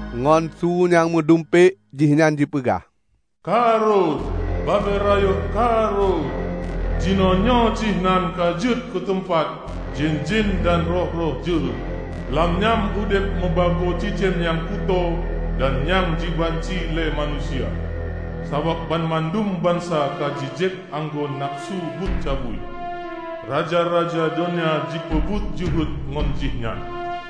Ngon su nyang meudumpék, jihnyan jipeugah, "Ka rhot! Babel ayeuk ka rhot! Jinoenyoe jihnyan ka jeuet keu teumpat jén-jén dan roh-roh jeuhet. Lam nyan udeb meubagoe cicém nyang kutoe dan nyang jibanci lé manusia. Sabab banmandum bansa ka jijieb anggô nafeusu buet cabui. Raja-raja donya jipeubuet jeuhet ngon jih nyan,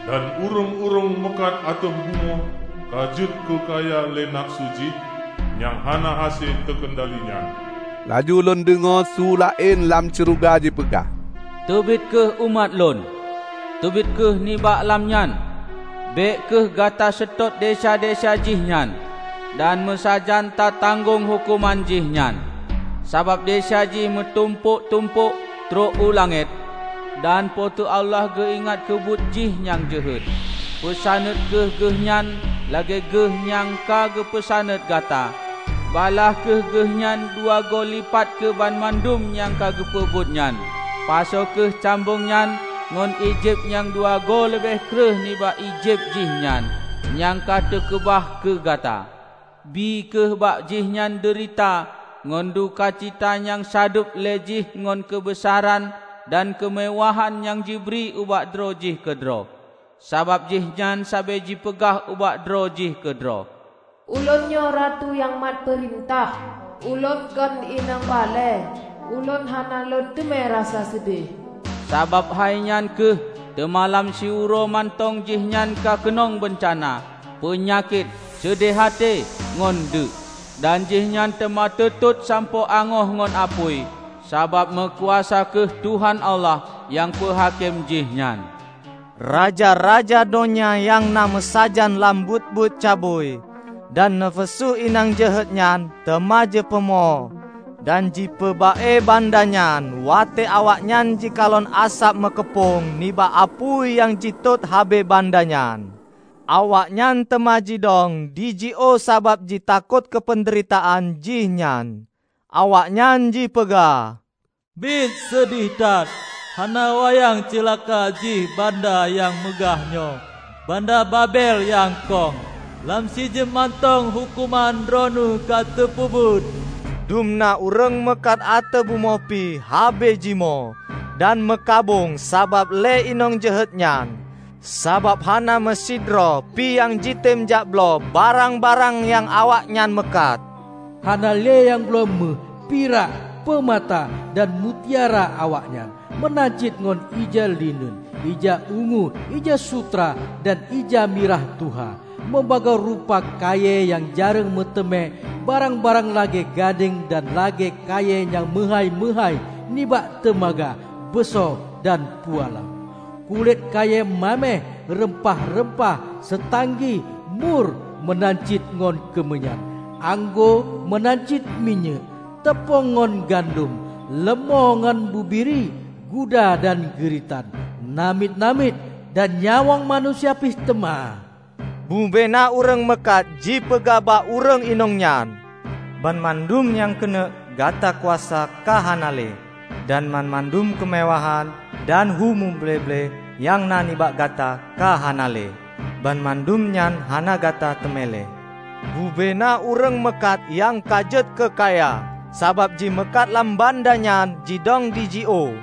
dan ureuëng-ureuëng meukat ateueh bumoe ka jeuet keu kaya lé nafeusu jih nyang hana hase teukeundali nyan." Laju lôn deungoe su laén lam syeuruga jipeugah, "Teubiet kheueh, umat Lôn! Teubiet kheueh nibak lam nyan! Bék kheueh gata seutôt desya-desya jih nyan, dan meusajan ta-tanggong huköman jih nyan! Sabab desya jih meutumpôk-tumpôk trok u langét, dan Po teu Allah geuingat keubuet jih nyang jeuhet. Peusaneut kheueh geuhnyan lagée geuh nyan ka geupeusaneut gata; balaih kheueh geuhnyan dua goe lipat keu banmandum nyang ka geupeubuet nyan. Pasoe kheueh cambong nyan ngon ié jieb nyang dua goe leubeh kreueh nibak ié jieb jih nyan, nyang ka teukeubah keu gata. Bie kheueh bak jihnyan deurita ngon dukacita nyang sadub lé jih ngon keubeusaran dan keumeuwahan nyang jibri ubak droe jih keudroe. Sabab jihnyan sabe jipeugah ubak droe jih keudroe, 'Ulôn nyoe ratu nyang mat peurintah! Ulôn kon inong balée; ulôn hana lôn teumé rasa seudeh!' Sabab hainyan kheueh, teuma lam siuroe mantong jihnyan ka keunong beuncana -- peunyakét, seudeh até, ngon deuek. Dan jihnyan teuma teutot sampoe angoh ngon apui, sabab meukuasa kheueh Tuhan Allah nyang peuhakém jih nyan." Raja-raja donya nyang na meusajan lam buet-buet cabui dan nafeusu inong jeuhet nyan teuma jipeumo dan jipeuba-e banda nyan watée awaknyan jikalon asab meukeupong nibak apui nyang jitot habéh banda nyan. Awaknyan teuma jidong dijiôh sabab jitakot keupeundeuritaan jih nyan. Awaknyan jipeugah, "Biet seudeh that, hana wayang ceulaka jih banda nyang meugah nyoe -- banda Babel nyang kong! Lam sijeuem mantong huköman droeneueh ka teupeubuet!" Dumna ureuëng meukat ateueh bumoe pih habéh jimoe dan meukabông sabab lé inong jeuhet nyan, sabab hana meusidroe pih nyang jitem jakbloe barang-barang nyang awaknyan meukat. Hana lé nyang bloe méuh, pirak, peumata, dan mutiara awaknyan; meunan cit ngon ija lineun, ija ungu, ija sutra, dan ija mirah tuha; meubagoe rupa kayée nyang jareueng meuteumé, barang-barang lagée gadeng dan lagée kayée nyang meuhái-meuhái, nibak teumaga, beuso dan pualam; kulét kayée maméh, reumpah-reumpah, seutanggi, mur, meunan cit ngon keumeunyan; anggô meunan cit minyéuk, teupông ngon gandom; leumô ngon bubiri, guda dan geuritan, namiet-namiet, dan nyawöng manusia pih teuma. Bubena ureuëng meukat jipeugah bak ureuëng inong nyan, "Banmandum nyang keuneuk gata kuasa ka hana lé, dan banmandum keumeuwahan dan hu muble-ble nyang na nibak gata ka hana lé. Banmandum nyan hana gata teumé lé!" Bubena ureuëng meukat nyang ka jeuet keukaya sabab jimeukat lam banda nyan jidong dijiôh,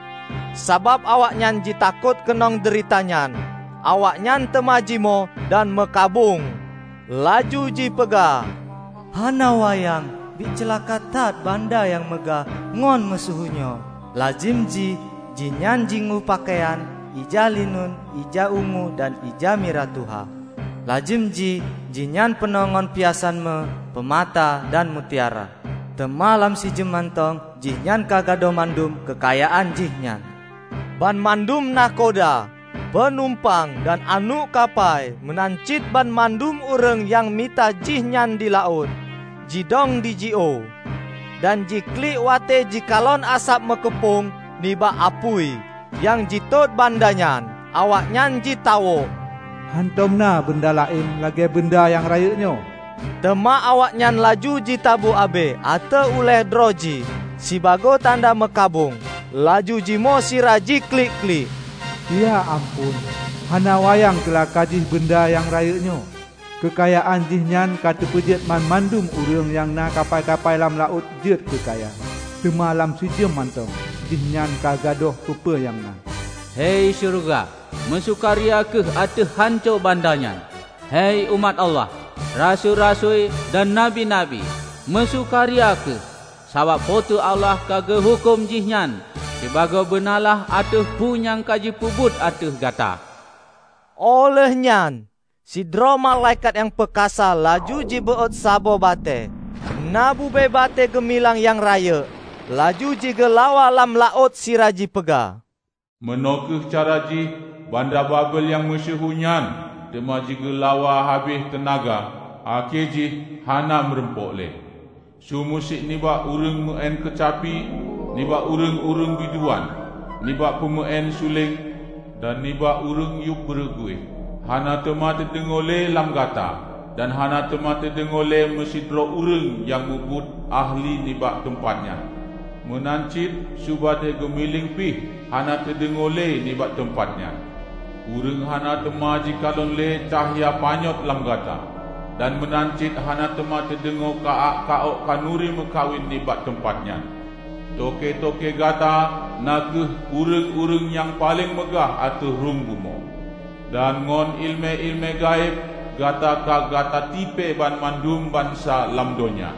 sabab awaknyan jitakot keunong deurita nyan. Awaknyan teuma jimoe dan meukabông, laju jipeugah, "Hana wayang, biet ceulaka that banda nyang meugah ngon meusyeuhu nyoe! Lazem jih jihnyan jingui peukayan ija lineun, ija ungu dan ija mirah tuha; lazem jih jihnyan peunoh ngon piasan méuh, peumata, dan mutiara! Teuma lam sijeuem mantong, jihnyan ka gadôh mandum keukayaan jih nyan!" Banmandum nakhoda, peunumpang, dan aneuëk kapai, meunan cit banmandum ureuëng nyang mita jihnyan di laôt, jidong dijiôh. Dan jiklik watée jikalon asab meukeupong nibak apui nyang jitot banda nyan. Awaknyan jitawök, "Hántom na banda laén lagée banda nyang rayeuk nyoe!" Teuma awaknyan laju jitabu abée ateueh ulée droe jih sibagoe tanda meukabông, laju jimoe sira jiklik-klik, "Ya amphon, hana wayang ceulaka jih banda nyang rayeuk nyoe! Keukayaan jihnyan ka teupeujeuet banmandum ureuëng nyang na kapai-kapai lam laôt ka jeuet keukaya! Teuma lam sijeuem mantong, jihnyan ka gadôh peue-peue nyang na!" Hai syeuruga, meusukaria kheueh ateueh hanco banda nyan! Hai umat Allah, rasui-rasui dan nabi-nabi, meusukaria kheueh! Sabab Po teu Allah ka geuhuköm jihnyan sibagoe beunalaih ateueh peue nyang ka jipeubuet ateueh gata! Óh lheueh nyan, sidroe malaikat nyang peukasa laju jibeuôt saboh batée -- na bube batée geumiléng nyang rayeuk -- laju jigeulawa lam laôt sira jipeugah, "Meunoe kheueh cara jih banda Babel nyang meusyeuhu nyan teuma jigeulawa habéh teunaga akhé jih hana meurumpok lé. Su musik nibak ureuëng meuén keucapi, nibak ureuëng-ureuëng biduan, nibak peumeuén suléng dan nibak ureuëng yub beureuguih, hana teuma teudeungoe lé lam gata; dan hana teuma teudeungoe lé meusidroe ureuëng nyang mubuet ahli nibak teumpat nyan, meunan cit su batée geumiléng pih hana teudeungoe lé nibak teumpat nyan. Ureuëng hana teuma jikalon lé cahya panyöt lam gata; dan meunan cit hana teuma teudeungoe ka-ak ka-ok khanuri meukawen nibak teumpat nyan. Toke-toke gata na kheueh ureuëng-ureuëng nyang paleng meugah ateueh rhueng bumoe, dan ngon iéleumé-iéleumé gaéb gata ka gata tipée banmandum bansa lam donya!"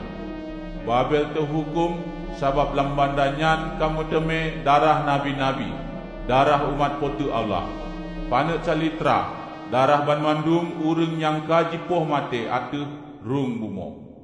Babel teuhuköm sabab lam banda nyan ka meuteumé darah nabi-nabi, darah umat Po teu Allah -- paneuk calitra darah banmandum ureuëng nyang ka jipoh maté ateueh rhueng bumoe.